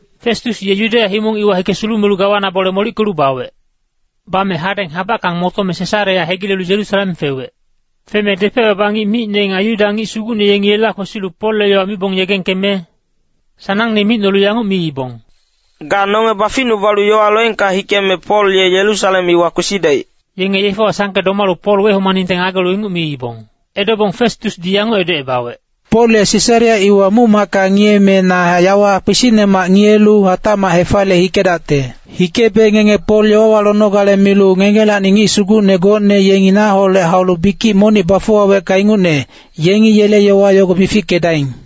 Festus ye Yudeya himong iwa hike sulumelu gawana bole molickelu bawec. Bame hadeng habackang motome Sesarea hegilelu Yerusalem fewec. Feme depec-baba ngic micne nga Yuda ngic sugucne yengi yela kwesilu Polle yowa mibong yegengkeme sanangne micnolu yanguc miibong, “Ga nonge baficnubalu yowa loengka hikeme Pol ye Yerusalem iwa kwesidaic.” Yenge yefewa sangke domalu Pol wehomaningte ngagelu inguc miibong. Edobong Festusdi yanguc edocebawec, “Pol ye Sesarea iwa muc-macka ngiyeme na yawa kpisicnemac ngiyelu hatacmac hefaliye hikedacte. Hikebe ngenge Pol yowawa lonogale milu ngengelacni ngic sugucne gocne yenge naholec haulu bikic monic bafuwawecka ingucne, yengi yele yowa yogo mifickedaing.”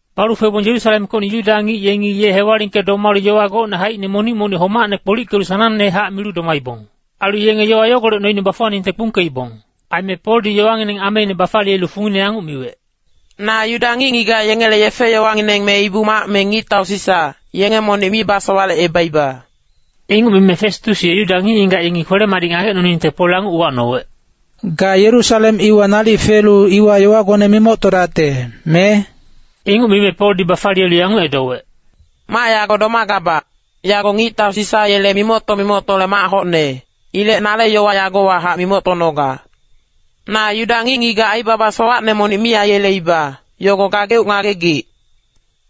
Balu febong Yerusalemkocni Yuda ngic yengi ye hewalingke domalu yowa gocne haicine monic-monic homacne kpolickelu sanangnehac milu domaibong. Ailu yenge yowa yogolec noine bafuwaningte kpungkeibong. Aime Poldi yowangineng ameine bafaliyelu fungine yanguc miwec, “Na Yuda ngic-ngigac yengele yefe-yowangineng me Ibu-mac me ngictau Sisa, yenge monic mi basowalecebaiba.” Inguc mime Festus ye Yuda ngic-ngigac yengi kwele-madic ngagecnoningte Pol yanguc uwacnowec, “Ga Yerusalem iwa nalic felu iwa yowagone mimoctodacte, me?” Inguc mime Poldi bafaliyelu yanguc edowec, “Mac yago domagabac, yago ngictau Sisa yele mimocto-mimoctole mac hocne, ilec nale yowa yagowahac mimoctonoga. Na Yuda ngic-ngigac aibaba sowacne monic mi aiyeleiba, yogo gageuc ngagegic.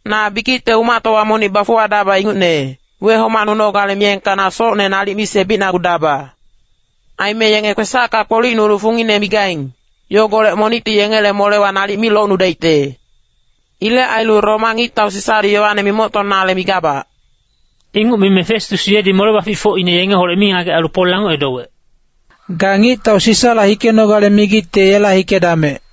Na bikicte umactowa monic bafuwadaba ingucne, wehomacnunogale miyengka na socne nalic mi sebicnagudaba. Aime yenge kwesacka kpolicnulu fungine migaing, yogolec monicti yengele molewa nalic mi locnudaicte. Ilec ailu Roma ngictau Sisadi yowane mimoctonale migabac.” Inguc mime Festus yedi mole-baficfocine yengeholec mingagec ailu Pol yanguc edowec, “Ga ngictau Sisala hikenogale migicte yela hikedamec.”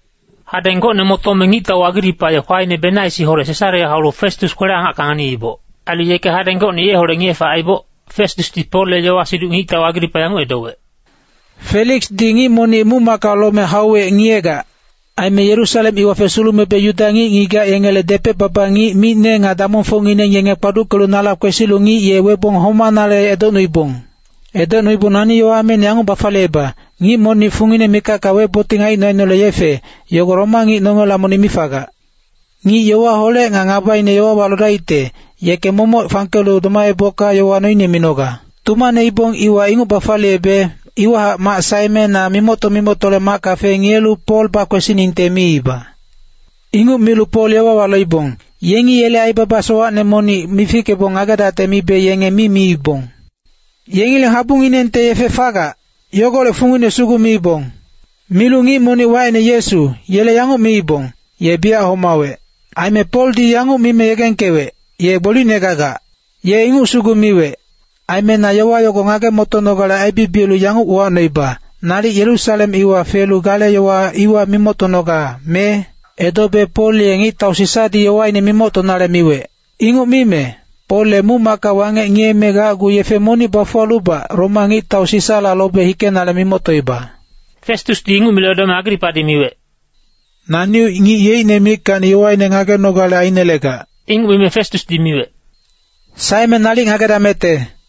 Hadeng gocne motome ngictau Agripa ye kwaine Benaisiholec Sesarea haulu Festus kwele-angacka nganiiboc. Ailu yeke hadeng gocne yeholec ngiye-fac aiboc, Festusdi Polle yowa-siduc ngictau Agripa yanguc edowec, “Feliksdi ngic monic muc-macka lome hauwec ngiyegac. Aime Yerusalem iwa fesulumebe Yuda ngic-ngigac yengele depec-baba ngic micne nga damongfocngineng yenge kpaduckelu nala kwesilu ngic ye webong homanale edocnuibong. Edocnubong nani yowa ameine yanguc bafaliyeiba, ‘Ngic monic fungine mikacka weboting aicno-aicnole yefe, yogo Roma ngic nongela monic mi fagac. Ngic yowaholec nga ngabaine yowawa lodaicte, yeke momoc fangkelu domaebocka yowa noine minoga.’ “Tumaneibong iwa inguc bafaliyebe, iwahac mac saeme na mimocto-mimoctole macka fengiyelu Pol bakwesiningte miiba. Inguc milu Pol yowawa loibong, yengi yele aibaba sowacne monic mifickebong ngagedacte mibe yenge mi miibong. Yengileng habunginengte yefe fagac, yogolec fungine sugu miibong. Milu ngic monic wacine Yesu, yele yanguc miibong, ‘Ye biyac homawec.’ Aime Poldi yanguc mime yegengkewec, ‘Ye gbolicne gagac.’ Ye inguc sugu miwec. Aime na yowa yogo ngage-motonogale aibibiyelu yanguc uwacnoiba, ‘Nalic Yerusalem iwa felu gale yowa iwa mimoctonoga, me?’ “Edobe Pol ye ngictau Sisadi yowaine mimoctonale miwec. Inguc mime, Pol ye muc-macka wangec ngiyeme gacgu yefe monic bafuwalubac Roma ngictau Sisala lobe hikenale mimoctoiba.” Festusdi inguc milu edome Agripadi miwec, “Naneuc ngic yeicne mickacni yowaine ngagenogale ainelegac.” Inguc mime Festusdi miwec, “Saeme nalic ngagedamecte.”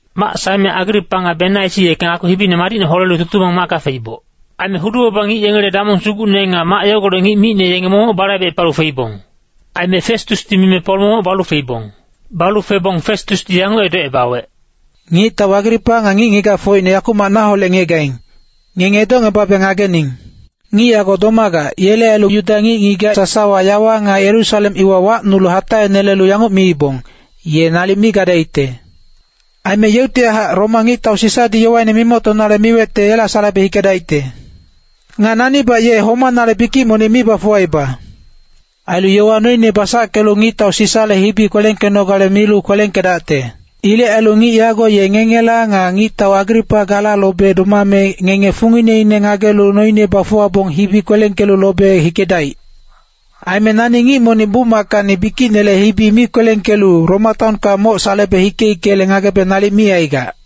Mac saeme Agripa nga Benaisi yeke ngakpi hibine madicne holelu tutumang macka feiboc. Aime hudu-baba ngic yengele damong sugucne nga mac yogolec ngic micne yenge momoc balaibecepalu feibong. Aime Festusdi mime Pol momoc balu feibong. Balu febong Festusdi yanguc edocebawec, “Ngictau Agripa nga ngic-ngigacfocne yakumac naholec ngiyegaing, ngenge edocngebabe ngagening. Ngic yago domagac, yele ailu Yuda ngic-ngigac sasawa yawa nga Yerusalem iwa wacnulu hataenelelu yanguc miibong, ‘Ye nalic mi gadaicte.’ Aime yeuctihac Roma ngictau Sisadi yowaine mimoctonale miwecte yela salebe hikedaicte. Nga nanibac ye homanale bikic monic mi bafuwaiba. Ailu yowa noine basackelu ngictau Sisale hibi kwelengkenogale milu kwelengkedacte. Ilec ailu ngic yago ye ngengela nga ngictau Agripa gala lobe domame ngenge fungineine ngagelu noine bafuwabong hibi kwelengkelu lobe hikedaic. Aime nani ngic monic muc-mackacni bikicinele hibi mi kwelengkelu Roma taonka moc salebe hike-hikele ngagebe nalic mi aigac.”